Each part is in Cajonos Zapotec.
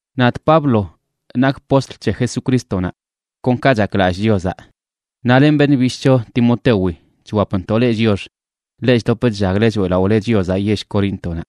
Nadꞌ Pablo nakꞌ postl c̱he Jesucrístonaꞌ kon ka chaklallꞌ Chiozaꞌ, naꞌ len beṉꞌ bishꞌcho Timotewi chwapntoꞌ leꞌ chiox, leꞌ chdop chllagle choeꞌlaꞌole Chiozaꞌ yell Coríntonaꞌ.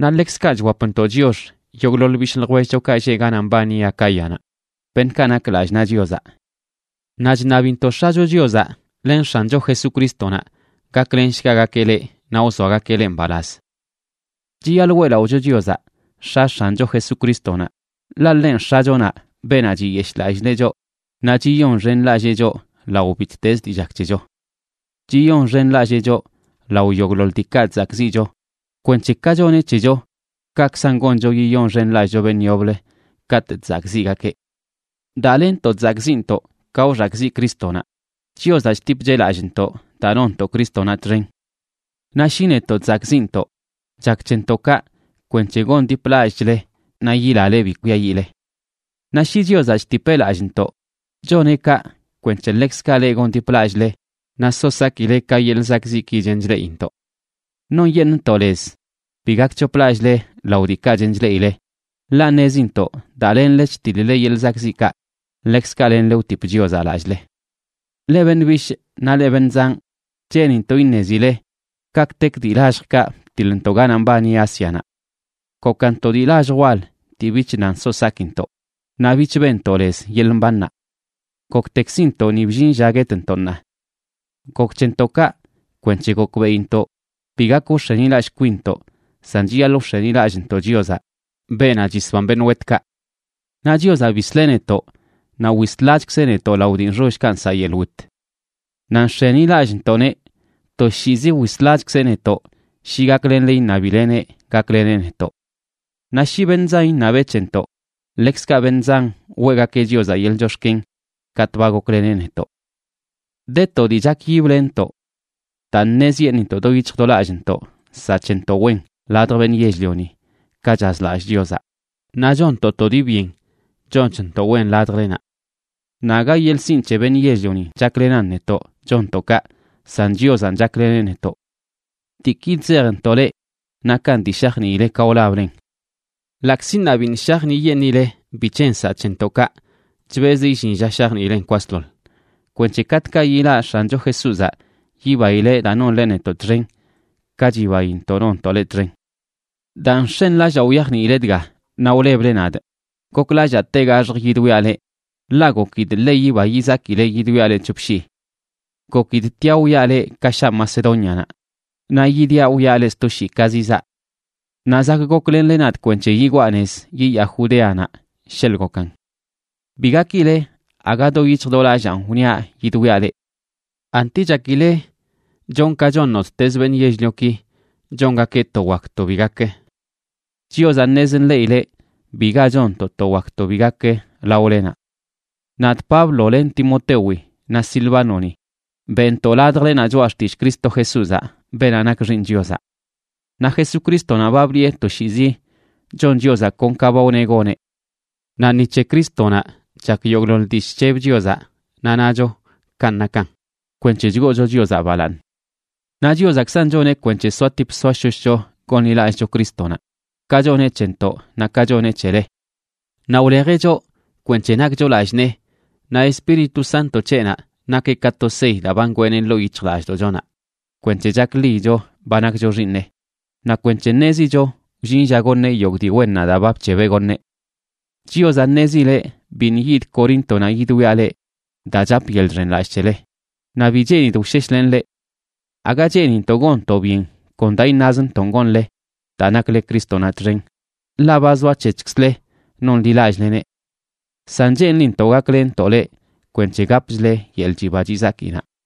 Naꞌ ḻekzkaꞌ chwapntoꞌ chiox yogꞌḻoḻ bishꞌ ljwellchokaꞌ lleꞌ ganaꞌ mbani Acáyanaꞌ, beṉꞌkaꞌ nak lallꞌ naꞌ Chiozaꞌ. Naꞌ chṉabintoꞌ X̱acho Chiozaꞌ len X̱ancho Jesucrístonaꞌ gaklenshgagakeꞌ leꞌ naꞌ wzoagakeꞌ leꞌ mbalaz. Chiyaḻꞌ weꞌlaꞌocho Chiozaꞌ, X̱a X̱ancho Jesucrístonaꞌ, ḻaꞌ ḻenꞌ X̱achonaꞌ, beenaꞌ chiyeshꞌlallileꞌ choꞌ naꞌ chiyonxenlallee choꞌ lao bittezə dii chak c̱hecho. Chiyonxenlallee choꞌ lao yogꞌḻoḻ diikaꞌ chzakꞌziꞌcho kwenc̱he ka choneꞌ c̱hecho, kaꞌkzan goncho yiyonxenlallꞌcho beṉꞌ yoblə katꞌ chzakꞌziꞌgakeꞌ. Daa lenntoꞌ chzakꞌziꞌntoꞌ ka wxakꞌziꞌ Crístonaꞌ, Chiozaꞌ chtipcheꞌ lallꞌntoꞌ daa nonntoꞌ Crístonaꞌ txen. Naꞌ shi netoꞌ chzakꞌziꞌntoꞌ, chak c̱hentoꞌ kaꞌ kwenc̱he gondiplallꞌchle naꞌ yilale bi kwiayiꞌle. Naꞌ shi Chiozaꞌ chtipeꞌ lallꞌntoꞌ, choneꞌ kaꞌ kwenc̱he ḻekzkaꞌ leꞌ gondiplallꞌle naꞌ so sakileꞌ ka yeḻꞌ zakꞌziꞌki chen chleꞌintoꞌ. Nonyeṉꞌntoꞌ lez bi gakc̱hoplallꞌle lao diikaꞌ chen chleꞌile, ḻaꞌ ṉezintoꞌ daa lenle chtiḻ-le yeḻꞌ zakꞌziꞌkaꞌ, ḻekzkaꞌ lenle wtip Chiozaꞌ lallꞌle. Leꞌ beṉꞌ bishꞌ naꞌ leꞌ beṉꞌ zanꞌ, cheenintoꞌ iṉezileꞌ kaꞌkꞌtek dii lalljkaꞌ btiḻntoꞌ ganaꞌ mbani Ásianaꞌ. Gokan to dii lallj wal dii bich nan so sakintoꞌ, naꞌ bich benntoꞌ lez yeḻꞌ mbannaꞌ. Goktekzintoꞌ ni bllin lla guetntoꞌ ṉaa. Gok c̱hentoꞌ kaꞌ kwenc̱he gokbeꞌintoꞌ bi gak wx̱enilallꞌ kwinntoꞌ, san chiyaḻꞌ wx̱enilallꞌntoꞌ Chiozaꞌ, beenaꞌ chisban beṉꞌ wetkaꞌ. Naꞌ Chiozaꞌ bisleꞌ netoꞌ naꞌ wislachkzeꞌ netoꞌ lao dii nxollkaꞌ nsaꞌ yeḻꞌ wit. Naꞌ nx̱enilallꞌntoꞌneꞌ toshiizi wislachkzeꞌ netoꞌ shi gaklenle iṉabileneꞌ gakleneꞌ netoꞌ. Naꞌ shi beṉꞌ zan iṉabeꞌ c̱hentoꞌ, ḻekzkaꞌ beṉꞌ zan weꞌgakeꞌ Chiozaꞌ yeḻꞌ chox̱ken katꞌ ba gokleneꞌ netoꞌ. De to dii chakyiblenntoꞌ: daa ṉezyeṉꞌintoꞌ do yic̱hj do lallntoꞌ nsaꞌ c̱hentoꞌ wen ladj beṉꞌ yell-lioni, ka chazlallꞌ Chiozaꞌ, naꞌ chonntoꞌ to dii byen chonchntoꞌ wen ladjlenaꞌ. Naꞌ aga yeḻꞌ sinꞌ c̱he beṉꞌ yell-lionin chaklenan netoꞌ chonntoꞌ kaꞌ, san Chiozanꞌ chakleneꞌ netoꞌ. Diiki chzejntoꞌ leꞌ nakan dii shajniile ka wlablen. Ḻaꞌkzi ṉaa biṉꞌ shajniꞌyeṉꞌile bic̱he nsaꞌ c̱hentoꞌ kaꞌ, chbezꞌ illin lla shajniilen kwasḻoḻ, kwenc̱he katꞌkaꞌ yilaꞌ X̱ancho Jesúzaꞌ, yibaileꞌ daa nonle netoꞌ txen, ka chibaintoꞌ nontoꞌ leꞌ txen. Daa nx̱enlallaa wyajniile dga naꞌ wleble nadꞌ, goklallaa tegaxjꞌ yidwiaꞌ leꞌ, ḻaꞌ gokidꞌ ḻe yiba yizakile yidwiaꞌ leꞌ c̱hop shii. Gokidꞌ tiaꞌ wwiaꞌ leꞌ ka shaa Macedónianaꞌ, naꞌ yidiaꞌ wwiaꞌ leꞌ sto shii ka zizaa. Naꞌ zak goklenle nadꞌ kwenc̱he yigwaa nez yiyaa Judeanaꞌ, sheḻꞌ gokan. Bi gakile aga do yic̱hj do lallaan wniaꞌ yidwiaꞌ leꞌ. ¿Anti chakile chonꞌ ka chon nottezə beṉꞌ yell-lioki chongakeꞌ to “wak” to “bi gakə”? Chiozaꞌ ṉez nḻeꞌileꞌ biga chonntoꞌ to “wak” to “bi gakə” laolenaꞌ. Nadꞌ Pablo, len Timotewi naꞌ Silvánoni beꞌntoꞌ ladjlenaꞌ choꞌa xtillꞌ Cristo Jesúzaꞌ, beenaꞌ nak Xiiṉ Chiozaꞌ. Naꞌ Jesucrístonaꞌ ba bliꞌe toshiizi chon Chiozaꞌ kon ka ba wneꞌ goneꞌ. Naꞌ ni c̱he Crístonaꞌ chak yogꞌḻoḻ dii chc̱heb Chiozaꞌ, naꞌ nacho “kanꞌ nakan” kwenc̱he chgoocho Chiozaꞌ balaaṉ. Naꞌ Chiozaꞌkzan choneꞌ kwenc̱he soatip soashoshcho gonḻilallꞌcho Crístonaꞌ, ka choneꞌ c̱hentoꞌ naꞌ ka choneꞌ c̱hele. Naꞌ wlejeꞌ choꞌ kwenc̱he nakcho lallꞌ nee, naꞌ Espíritu Santo c̱heꞌnaꞌ nakeꞌ ka to sey daa ba ngweeneꞌ ḻoo yic̱hjlallꞌdoꞌchonaꞌ kwenc̱he chakḻiyicho ba nakcho xiiṉeꞌ, naꞌ kwenc̱he ṉezicho wllin lla goṉeꞌ yogꞌ dii wennaꞌ daa ba bc̱hebeꞌ goṉeꞌ. Chiozaꞌ ṉezileꞌ biṉꞌ yidꞌ Coríntonaꞌ yidwiaꞌ leꞌ daa chapꞌ yeḻꞌ chxenlallꞌ c̱hele, naꞌ bi cheenidꞌ wsheshlenꞌ leꞌ. Aga cheenintoꞌ gonntoꞌ byen kon daa iṉazntonꞌ gonle daa nakle Crístonaꞌ txen, ḻaꞌ ba zoac̱hec̱hkzle nonḻilallꞌleneꞌ. San cheenlintoꞌ gaklenntoꞌ leꞌ kwenc̱he gapchle yeḻꞌ chiba chizakinaꞌ.